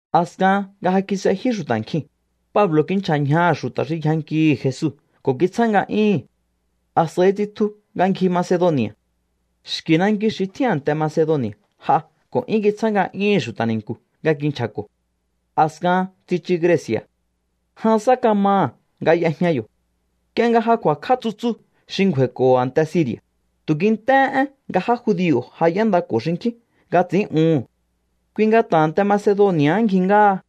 A̱skahan nga ja kis'ejyú xu̱ta̱ nkjiu̱n, Pablo̱ kinchja̱ ñjaha̱ xu̱ta̱ xi yjankihi̱ Jesu ko̱ kitsjá nga'yúhu̱n. A̱s'a̱i tsitju nga ngji Macedoni̱a̱. Xki̱ nanki xi tjín a̱nte Macedoni̱a̱ j'a ko̱ 'yún kitsjá nga'yúhu̱n xu̱ta̱ ni̱nku̱ nga kinchja̱ko̱. A̱skahan tsichu Greci̱a̱. Jan sá kamaha̱ nga y'ejña yo̱. Nk'ie nga ja ku̱a̱kj'á tsutsu xi ngju̱a̱i̱ko̱ho̱ a̱nte Siri̱a̱, tu̱ kint'éhé én nga já judio̱ ja y'éndako̱ xinkjín nga ts'i̱ín'uhu̱n. Kui nga ta̱ a̱nte Macedoni̱a̱ ngji ngáha.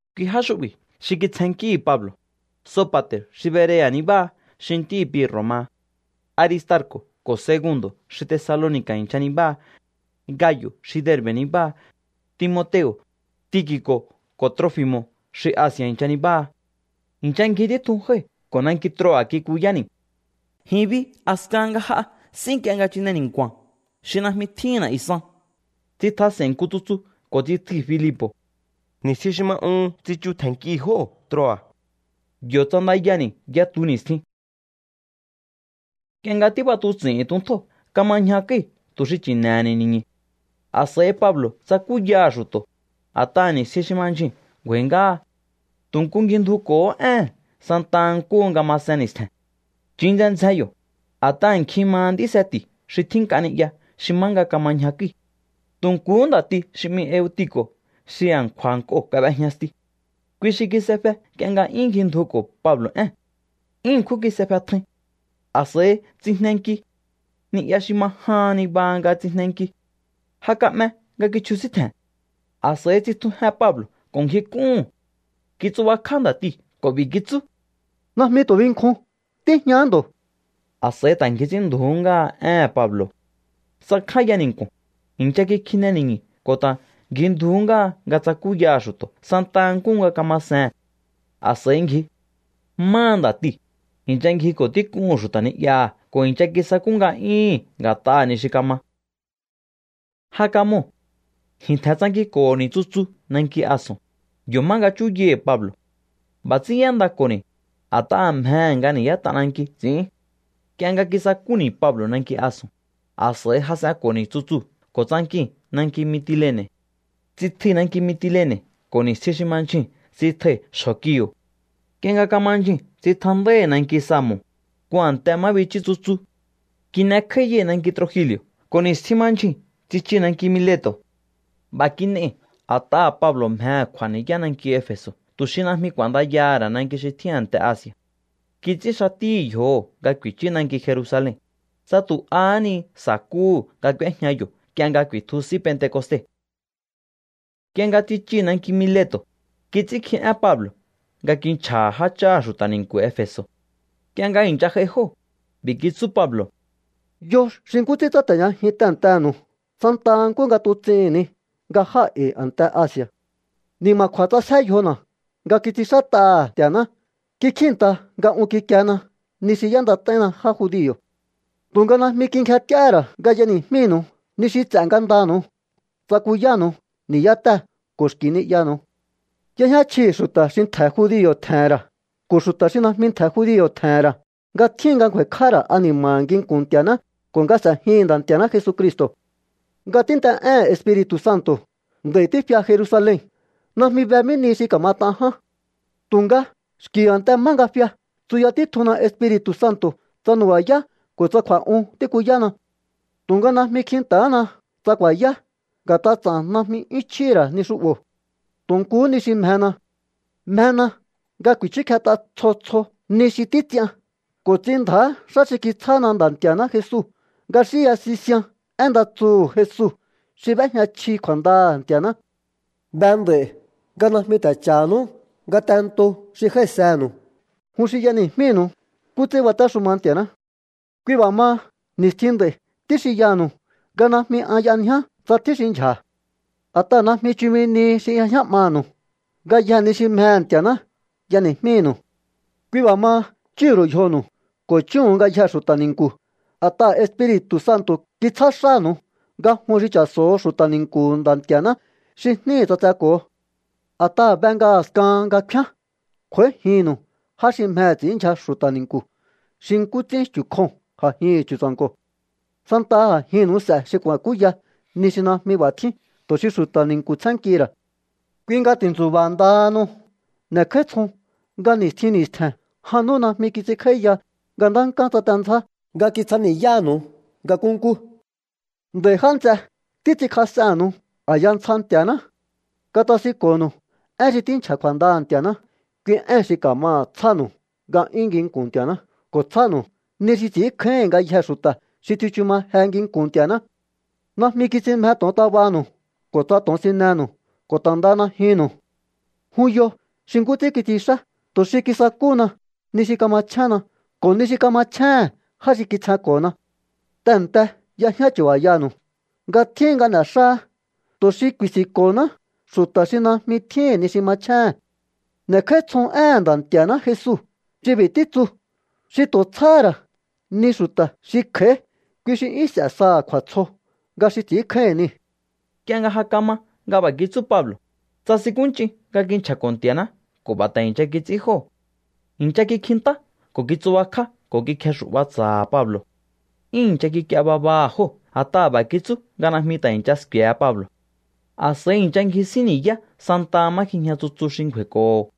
Kui já xu'bi̱ xi kitsjennkíhi̱ Pablo̱: Sopa̱te̱r xi Berea̱ nibáha xi ntíhi̱ Pirro̱ maha, Aristarco̱ ko̱ Segundo̱ xi Tesaloni̱ka̱ i̱ncha nibáha, Gayo̱ xi Derbe̱ nibáha, Timoteo̱, Tiki̱co̱ ko̱ Trofi̱mo̱ xi Asi̱a̱ i̱ncha nibáha. I̱ncha ngji títjun jái̱ ko̱ nanki Troa̱ kikuyáni̱. Ji̱n bi a̱skahan nga j'a s'í nk'ie nga chine ni̱nku̱a̱n xi najmi tjíhi̱n na̱'yu̱ san, tsitjas'e̱i̱n nku tsutsu ko̱ tsitjui̱ Filipo̱. Ni̱stjin xi ma uhun tsichu tje̱nnkii̱ jóo̱ Troa̱. Yo̱ ts'andayani̱ yatu ni̱stjin. Nk'ie nga tíb'atuts'i̱hi̱n tuntjóo̱ kama ñjakúi̱ tu̱ xi chi̱ne̱he̱ni̱ ni̱ñu̱. A̱s'a̱i Pablo̱ tsakúyaha̱ xu̱to̱, a̱t'aha̱ ni̱stjin xi ma ndyjuu̱n ngju̱a̱i̱ ngáha. Tu̱ nku ngjindjuko̱hó ée̱n santaha nkúhu nga masen ni̱stje̱n. Chun ndzjen ndzjen yo̱, a̱t'aha̱ nkjin maha nd'í seti̱ xi tjín nk'a ni'ya xi má nga kama ñjakúi̱. Tu̱ nkuhú nda̱ti xi 'mi Eutiko̱ xi a̱nkju̱a̱ nk'oo̱ kab'ejña stiu̱. Kui xi kis'efe nk'ie nga 'yún ngjindjuko̱ Pablo̱ ée̱n. 'Yún ṉkjún kis'efe tjain. A̱s'a̱i tsijnenki. Ni'ya xi ma jahan niba nga tsijnenki. Ja ka'me nga kichjusíntje̱n. A̱s'a̱i tsitjujen Pablo̱ ko̱ ngjik'úhu̱n. Kitsubakj'á nda̱tiu̱ ko̱ b'i̱ kitsú: —Najmi tu̱ binkjun. Tíjñahá ndo̱. A̱s'a̱i ta̱ ngji ts'ínndju̱ú ngáha éhe̱n Pablo̱. Tsakjánya ni̱nku̱o̱n, i̱ncha kikjine ni̱ñu̱ ko̱ ta̱ ngjindjuhú ngáha nga tsakúyaha̱ xu̱to̱ santa nkúhu nga kama see̱n. A̱s'a̱i ngji. Máha nda̱tiu̱, i̱ncha ngjiko̱ tík'uhu̱n xu̱ta̱ ni'yaha̱ ko̱ i̱ncha kisakú nga'yúhu̱n nga̱t'aha̱ ni xi kama. Ja kamoo̱. Ji̱n tje̱n tsankinko̱ho̱ni̱ tsutsu nanki Ason, yo̱ má nga chúyai̱hi̱ Pablo̱. B'a̱ ts'ín y'éndako̱ni̱, a̱t'aha̱ mjehe̱ nga ni̱yá t'ananki ts'i̱ín. Nk'ie nga kisakúni̱ Pablo̱ nanki Ason, a̱s'a̱i jas'enko̱ni̱ tsutsuu̱ ko̱ tsankii̱n nanki Mitilene̱. Tsitjui̱ nanki Mitilene̱ ko̱ ni̱stjin xi ma ndyjuu̱n tsitjai̱ xjo̱ Kio̱. Nk'ie nga kama ndyjuu̱n tsitjandái̱ nanki Samo̱, nku a̱nte má bichú tsutsu. Kin'ekj'áíyai̱ nanki Trogili̱o̱ ko̱ ni̱stjin ma ndyjuu̱n tsichii̱ nanki Mileto̱. B'a̱ kin'ei̱ a̱t'aha̱ Pablo̱ mjehe̱ kj'u̱a̱ ni̱yá nanki Efe̱so̱ tu̱ xi najmi k'u̱a̱ndayaha̱ ra̱ nanki xi tjín a̱nte Asi̱a̱. Kits'ín xatíhi̱ yjoho̱ nga ku̱i̱chú nanki Jerusalen, tsa tu̱ ahá ni sa̱kúhu̱ nga k'úéjña yo̱ nk'ie nga ku̱i̱tju S'í Pentecoste. Nk'ie nga tsichii̱ nanki Mileto̱, kits'ínkji én Pablo̱ nga kinchja̱ha̱ jácháha̱ xu̱ta̱ ni̱nku̱ Efe̱so̱. Nk'ie nga i̱ncha j'ai jóo̱, b'i̱ kitsú Pablo̱: —Yo xi nkú ts'ín tsáte̱jñajin tehe̱ntenu̱u santa nkúhu nga tuts'ihi̱n ni nga jáa̱ e̱i̱ a̱nte Asi̱a̱. Ni̱ma̱kju̱a̱ ts'asjé yjona̱ nga kits'inxát'aha̱ Nti̱a̱ná. Kikjíi̱nta nga un kikiena ni xi y'éndat'áínna já judio̱. Tu̱nga najmi kingjent'íáhá ra̱ nga y'eni̱jmínu̱u ni xi ts'e̱ ngandanu̱u. Tsakuyánu̱u ni̱yátée̱ ko̱ xki̱ ni'yanu̱u. Y'ejñá chjihi̱ xu̱ta̱ xi ntje̱ judio̱ tje̱he̱n ra̱ ko̱ xu̱ta̱ xi najmi ntje̱ judio̱ tje̱he̱n ra̱ nga tjíhin nga ngju̱a̱i̱kj'áha̱ ra̱ ani̱ma̱ha̱ nginku̱n Nti̱a̱ná ko̱ nga s'e̱jihi̱n Nda̱ Nti̱a̱ná Jesucristo̱. ’Nga tínt'e'éhe̱n Espiri̱tu̱ Santo̱ nd'a̱i̱ tífia Jerusalen. Najmi be mí nihi xi ka̱mat'an ján. Tu̱nga xki̱ a̱nte má nga fia tsuya títjunna Espiri̱tu̱ Santo̱ tsa nu̱ba̱yá ko̱ tsa kju̱a̱'un tíkuyána. Tu̱nga najmi kjinta̱hána tsa ku̱a̱yá. Nga̱t'a ts'a̱n najmi 'yún chjíhi̱ ra̱ ni xu'bo̱. Tu̱ nkuhú ni xi mjena. Mjena nga ku̱i̱chúkjet'a tsjo tsjo ni xi títs'ian ko̱ ts'inndja̱á xá xi kitsjána Nda̱ Nti̱a̱ná Jesu, nga xínya sisian én nda tsuhu̱ Jesu xi b'éjña chji kju̱a̱ndaha̱ Nti̱a̱ná. ’Be nd'a̱i̱ nga najmi ta̱ cha̱hanú ngatento xi jái̱senu̱u, jun xi y'eni̱jmínu̱u nkú ts'ín batéxuma Nti̱a̱ná. Kui b'a̱ maha, ni̱stjin nd'a̱i̱ tíxinyaha̱nu̱u nga najmi an y'anjiá tsa tjín xi ndyja̱. A̱t'aha̱ najmi chumi nihi xi y'ejñá 'manu̱u. Ngayjee̱ ni xi mjehe̱ Nti̱a̱ná y'eni̱jmínu̱u. ’Kui b'a̱ maha, chúhu̱n ru̱u yjonu̱u ko̱ chúhu̱un ngayjee̱ xu̱ta̱ ni̱nku̱. A̱t'aha̱ Espiri̱tu̱ Santo̱ kitsjá xánu̱u nga jun xi cha̱so̱ho̱ xu̱ta̱ ni̱nku̱hu̱ Nda̱ Nti̱a̱ná xi jníhi̱ ts'atseko̱ho. A̱t'aha̱ be nga a̱skahan nga kfíán kj'u̱a̱íjinnu̱u já xi mjehe̱ ts'i̱ínndyja xu̱ta̱ ni̱nku̱ xi nkú ts'ín chu̱ kjoo̱n a̱jihi̱n chu̱tsa̱nko̱. Santaha a̱jinnu̱u s'e̱ xi ku̱a̱kúya ni xi najmi b'a̱ tjín tu̱ xi xu̱ta̱ ni̱nku̱ tsjénnkihi̱ ra̱. Kui nga ti̱ntsu̱ba̱ ndahanu. N'e̱kj'áítsjon nga ni̱stjin ni̱stje̱n jan nú najmi kits'inkj'áíya nga ntánkán tsatendzjá nga kitsjani̱yáha̱nu̱u nga nkúnkú. ’Nd'a̱i̱ já nts'e, títs'inkjas'ennu̱u a̱ya ntsja Nti̱a̱ná. Katasinko̱nu̱u én xi tínchja̱ kju̱a̱ndaha̱ Nti̱a̱ná, kui éhe̱n xi ka̱maha̱ tsjánu̱u nga'yún nginku̱n Nti̱a̱ná ko̱ tsjánu̱u ni xi ts'i̱ínkjáíhi̱n ngayjee̱ xu̱ta̱ xi tsichu ma je nginku̱n Nti̱a̱ná. Najmi kits'in mje to̱ontabanu̱u ko̱ tsa to̱onsinenu̱u ko̱ ta̱ ndaha najyunnu̱u. Jun yo xi nkú ts'ín kits'inxá tu̱ xi kisakúhuna ni xi kamachjénna ko̱ ni xi kamachjéhe̱n já xi kitsjenko̱na. Tehe̱nte y'ejñá chu̱ba̱yanu̱u nga tjíhin nga n'e̱xáá tu̱ xi ku̱i̱si̱nko̱honá xu̱ta̱ xi najmi tjíhi̱n ni xi machjéhe̱n. N'e̱kj'áítsjon éhe̱n Nda̱ Nti̱a̱ná Jesu xi b'i̱ títsu: “Xi tu̱ tsjáhá ra̱ ni xu̱ta̱ xi kj'a̱í, kui xi 'yún s'e saha̱ kju̱a̱tsjo nga xi ts'ínkjáíhi̱n niu̱.” Nk'ie nga ja kama nga b'a̱ kitsú Pablo̱, tsasinkúnch'in nga kinchja̱ko̱ Nti̱a̱ná ko̱ b'a̱ ta̱ i̱ncha kits'ín jóo̱. I̱ncha kikjintá ko̱ kitsubakjá ko̱ kikjexu̱'ba tsa̱ha̱ Pablo̱. 'Yún i̱ncha kik'ie babaha̱ jóo̱ a̱t'aha̱ b'a̱ kitsú nga najmi ta̱ i̱ncha sku̱e̱he Pablo̱. A̱s'a̱i i̱ncha ngjisín ni̱yá santaha má kjijña tsutsu xi ngju̱a̱i̱ko̱ho̱.